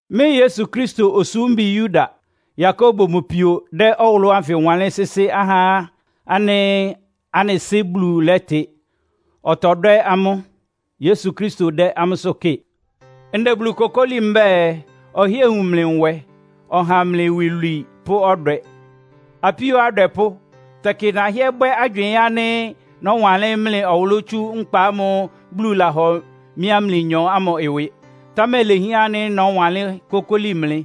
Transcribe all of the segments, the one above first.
Mɩ́ Yesu Kristo osúmbi Yuda, Yakobo mʋ pio dɛ́ ɔwʋlʋ́ ánfɩ wanlɩ́n sɩ́sɩ́ ahá ánɩ́ anɩ Sɩ́ Bulu lɛ́tɩ, ɔtɔdwɛ́ amʋ́, Yesu Kristo dɛ́ amʋ́sʋ́ kɩ́ɩ. Ndɛ Bulu kokóli mbɛ́ɛ, ɔhɩ́ɛ wun mlɩ nwɛ, ɔha mlɩ iwilwii pʋ́ ɔdwɛ. Apíó adwɛpʋ́, tɛkɩ nahɩ́ɛ́ bwɛ́ agywɩɩn ánɩ́ nɔ́wanlɩ́n mlɩ ɔwʋlʋ́ tsú nkpa ámʋ́ʋ́ Bulu lahɔ mɩ́a mlɩnyɔ ámʋ ɩwɩ. Támɛ ilehián ánɩ́ nɔ́wanlɩ́n kókóli mlɩ,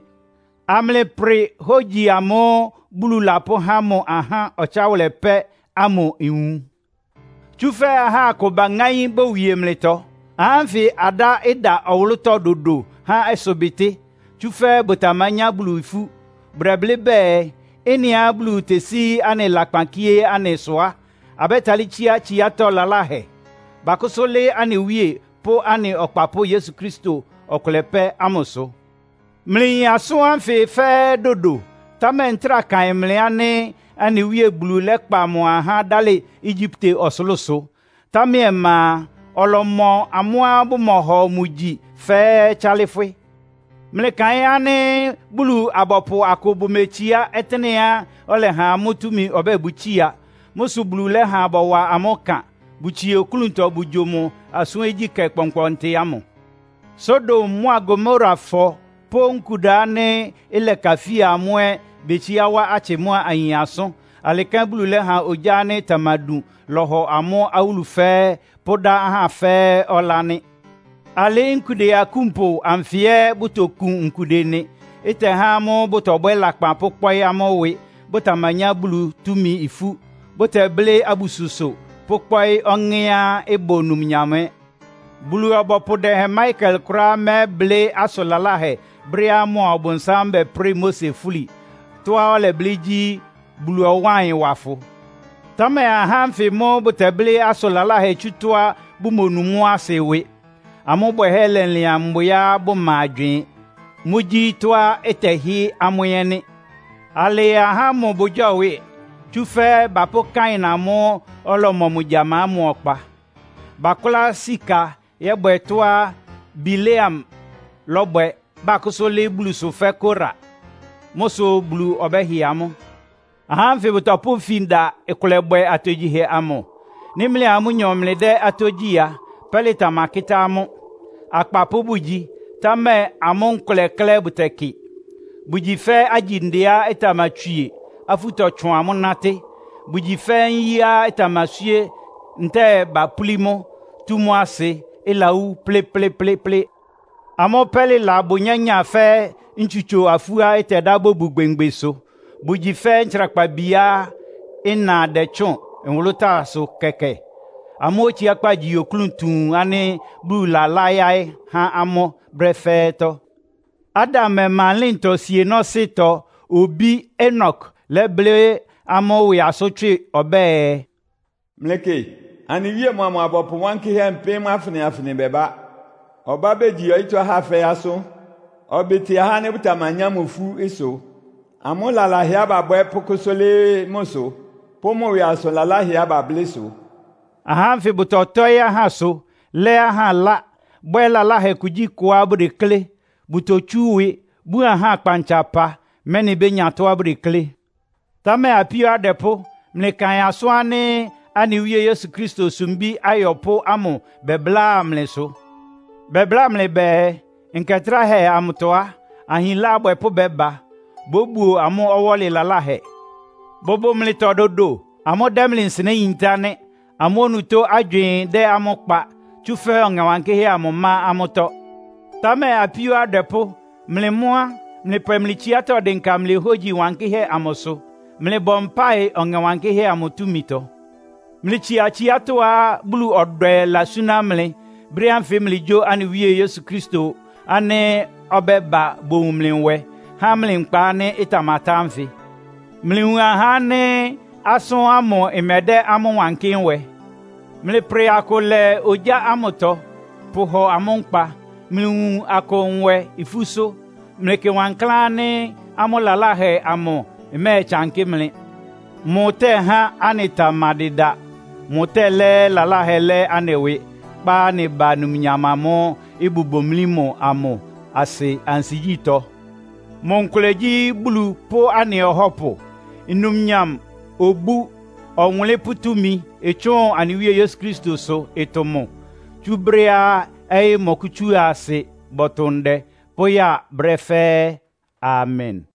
amlɩprɩ hógyi amʋ́ʋ́ Bulu lapʋ́há mʋ ahá ɔtsáwʋlɛ pɛ́ ámʋ nwun. Tsúfɛ́ aha akʋ baŋáín bowie mlɩtɔ. Ahá ánfɩ adá ɩda ɔwʋlʋ́tɔ́ dodo há ɩsʋbɩtɩ́, tsúfɛ́ bʋtamanyá Bulu ifú. Bʋdɛblɩ́ bɛɛ, ɩ́nɩá Bulu tesí anɩ lakpan kíé anɩ sʋ á, abɛ́talɩ́ tsíá tsiátɔ́ laláhɛ. Bakʋ́sʋ́ lɩ́ɩ́ anɩ Wíe pʋ́ anɩ Ɔkpapʋ́ Yesu Kristo ɔkʋlɛ pɛ́ ámʋsʋ. Mlɩyin asʋ́n ánfɩ fɛ́ɛ́ dodo, támɛ ntráa kaɩn mlɩ ánɩ́ anɩ Wíe Bulu lɛ́kpa mʋ ahá dálɩ Egyipte ɔsʋlʋ́sʋ, támɛ ɔma a, ɔlɔmɔ amʋ́á bʋmɔhɔ mʋ gyi fɛ́ɛ́ tsálɩ́fwɩ́. Mlɩkaɩn ánɩ́ Bulu-abɔpʋ akʋ bʋmetsiá ɔtɩ́nɛ́á ɔlɛha amʋ́ túmi ɔbɛ́ɛ bʋtsía. Mʋ́ sʋ Bulu lɛ́ha bɔwa amʋ́ ɩkan, bʋtsie oklúntɔ bʋgyo mʋ asʋ́n ogyíkɛ́ kpɔnkpɔntɩ ámʋ. Sodom mʋ́a Gomorafɔ pʋ́ nkuda ánɩ́ ɩlɛkafía amʋ́ ɛ́ betsiá wá atsɩ mʋ́a ayin asʋ́n. Alɩ kɛ́n Bulu lɛ́ha ogyá ánɩ́ ɩtamadun lɔ́hɔ amʋ́ awúlu fɛ́ɛ́, pʋ́dá ahá fɛ́ɛ́ ɔlá nɩ́. Alɩ́ nkude akúnpʋ anfɩ ɛ́ bʋtokun nkude nɩ. Ɩtɛhá amʋ́ bʋtɔbwɛ́ lakpan pʋ́kpɔ́ɩ́ amʋ́ ɩwɩ, bʋtamanyá Bulu túmi ifú. Bʋtɛblɩ́ abususʋ pʋ́kpɔ́ɩ́ ɔŋɛ́á ɩbʋ numnyam ɛ́. Bulu-ɔbɔpʋ dɛhɛn Mikael kʋ́ráá mɛ́blɩ́ asʋn laláhɛ brɛ́á mʋa Ɔbʋnsám bɛprɩ́ɩ Mose fúli. Tɔ́á ɔlɛblɩ́ gyí, “Bulu ɔwáa ɩyɩn wa fʋ!” Támɛ ahá ánfɩ mʋ́ bʋtɛblɩ́ asʋn laláhɛ tsú tɔ́á bʋmonu mʋ́ asɩ ɩwɩ. Amʋ́ bwɛhɛ́ lɛlɩan mbwɩá bʋma agywɩɩn. Mʋ́gyí tɔ́á ɩtɛhɩ́ amʋ́ ɛ́ nɩ́. Alɩ ahá ámʋ bʋgyɔ́wɩ! Tsúfɛ́ bapʋ́ Kain amʋ́ʋ́ ɔlɔmɔ mʋ gyama ámʋ ɔkpa. Bakʋla sika yɔ́bwɛ tɔ́á Bileam lɔ́bwɛ, bakʋ́sʋ́ lɩ́ɩ́ Bulusʋ fɛ́ Kora. Mʋ́ sʋ Bulu ɔbɛ́hɩ amʋ́. Ahá ánfɩ bʋtɔpʋ́ ifin da ɩkʋlɛbwɛ atogyihɛ amʋ. Nɩ́ mlɩa amʋ́nyɔ mlɩdɛ́ atógyí a, pɛ́lɩ tamakɩ́tá amʋ́. Akpapʋ́ bʋgyi, támɛ amʋ́ nkʋlɛ klɛ́ bʋtɛkɩ. Bʋgyi fɛ́ agyindeá ɩtamatswie, afú tɔtsʋan mʋ́ nátɩ́. Bʋgyi fɛ́ nyíá ɩtamaswíé ntɛ́ɛ bapúlí mʋ́, tú mʋ́ asɩ, ɩlawú plɩ́plɩ́plɩ́plɩ́. Amʋ́ pɛ́lɩla bʋ nyányáa fɛ́ ntsusʋ-afuá ɩtɛda bobun ogbémgbesʋ. Bʋgyi fɛ́ ntsrakpabiá ɩna dɛtsʋ́ʋn nwʋlʋ́táasʋ kɛkɛ. Amʋ́ otsiákpá gyí oklún tuun ánɩ́ Bulu lɛ́layáɩ́ há amʋ́ brɛ́ fɛ́ɛ́tɔ́. Adam ɔma ɩlɩ́ntɔ sienɔ́sɩ́tɔ obí Enok lɛ́blɩ́ amʋ́ ɩwɩ asʋ́n tswɩ. Ɔbɛ́ɛ, “Mlɩkɩ, anɩ Wíe mʋa mʋ abɔpʋ wankɩ́hɛ́ mpɩ́m afɩnɩ-afɩnɩ bɛbá. Ɔbá begyi ɔyɩ́tɔ́ ahá fɛ́ɛ́ asʋ́n, ɔbɩtɩ ahá ánɩ́ bʋtamanyá mʋ ifú ɩsʋ. Amʋ́ lalahɛá babwɛ́ pʋ́kʋ́sʋ́ lɩ́ɩ́ mʋsʋ, pʋ́ mʋ ɩwɩ asʋn laláhɛá bablɩ́ sʋ!” Ahá ánfɩ bʋtɔtɔ́ɩ́ ahásʋ, lɛ́ ahá ɩlá, bwɛ́ lalahɛ kugyíkʋá bʋdeklé. Bʋtotsú ɩwɩ, bun ahá kpantsapa, mɛ́nɩ bénya tɔ́á bʋdeklé. Támɛ apíó adwɛpʋ́, mlɩkaɩn asʋ́n ánɩ́ anɩ Wíe Yesu Kristo sumbí ayɔpʋ́ ámʋ bɛbláa mlɩsʋ. Bɛbláa mlɩ bɛɛ, “Nkɛ tráhɛ amʋtɔ á, ahinlá abwɛpʋ́ bɛ́ba. Bóbuo amʋ́ ɔwɔ́lɩ laláhɛ.” Bʋbʋ mlɩtɔ dodo. Amʋ́ dɛ́ mlɩ nsɩnɛ́ yintá nɩ́. Amʋ́ onutó agywɩɩn dɛ́ amʋ́ kpa, tsúfɛ́ Ɔŋɛ Wankɩ́hɛ́ amʋ má amʋ́tɔ́. Támɛ apíó adwɛpʋ́, mlɩ mʋ́ á, mlɩpwɛ mlɩ tsiátɔ́ dɩnka mlɩ hógyi wankɩ́hɛ́ amʋsʋ. Mlɩbɔ mpáɩ Ɔŋɛ Wankɩ́hɛ́ amʋ túmitɔ. Mlɩtsia tsiátɔ́á Bulu ɔdwɛ lasúná mlɩ, brɛ́ ánfɩ mlɩgyó anɩ Wíe Yesu Kristo ánɩ́ ɔbɛ́ba bowun mlɩ nwɛ, há mlɩ nkpa ánɩ́ ɩtamatá ánfɩ. Mlɩwun ahá ánɩ́ asʋ́n ámʋ ɩmɛdɛ́ amʋ́ wankɩ́ nwɛ. Mlɩprɩ akʋ lɛ ogyá ámʋtɔ, pʋhɔ amʋ́ nkpa. Mlɩwun akʋ nwɛ ifúsʋ́. Mlɩkɩ wankláán ánɩ́ amʋ́ lalahɛ amʋ ɩmɛ́ɛtsankɩ́ mlɩ. Mʋtɛ́há anɩtamadɩda. Mʋtɛ́lɛ́ lalahɛ lɛ́ anɩ ɩwɩ, kpá anɩ ba numnyam amʋ́ʋ́ ɩbʋ bomlí mʋ amʋ asɩ ansigyítɔ́. Mʋ nkʋlɛ gyí Bulu pʋ́ anɩ Ɔhɔ́pʋ. Numnyam, obú, ɔwʋnlɩ́n pʋ́ túmi ɩtsʋ́ʋn anɩ Wíe Yesu Kristosʋ ɩtʋ mʋ. Tsú brɛ́á ɔyɩ́ mɔkʋ́tsúa asɩ, bɔtʋ ndɛ pʋ́ya brɛ́ fɛ́ɛ́. Amen.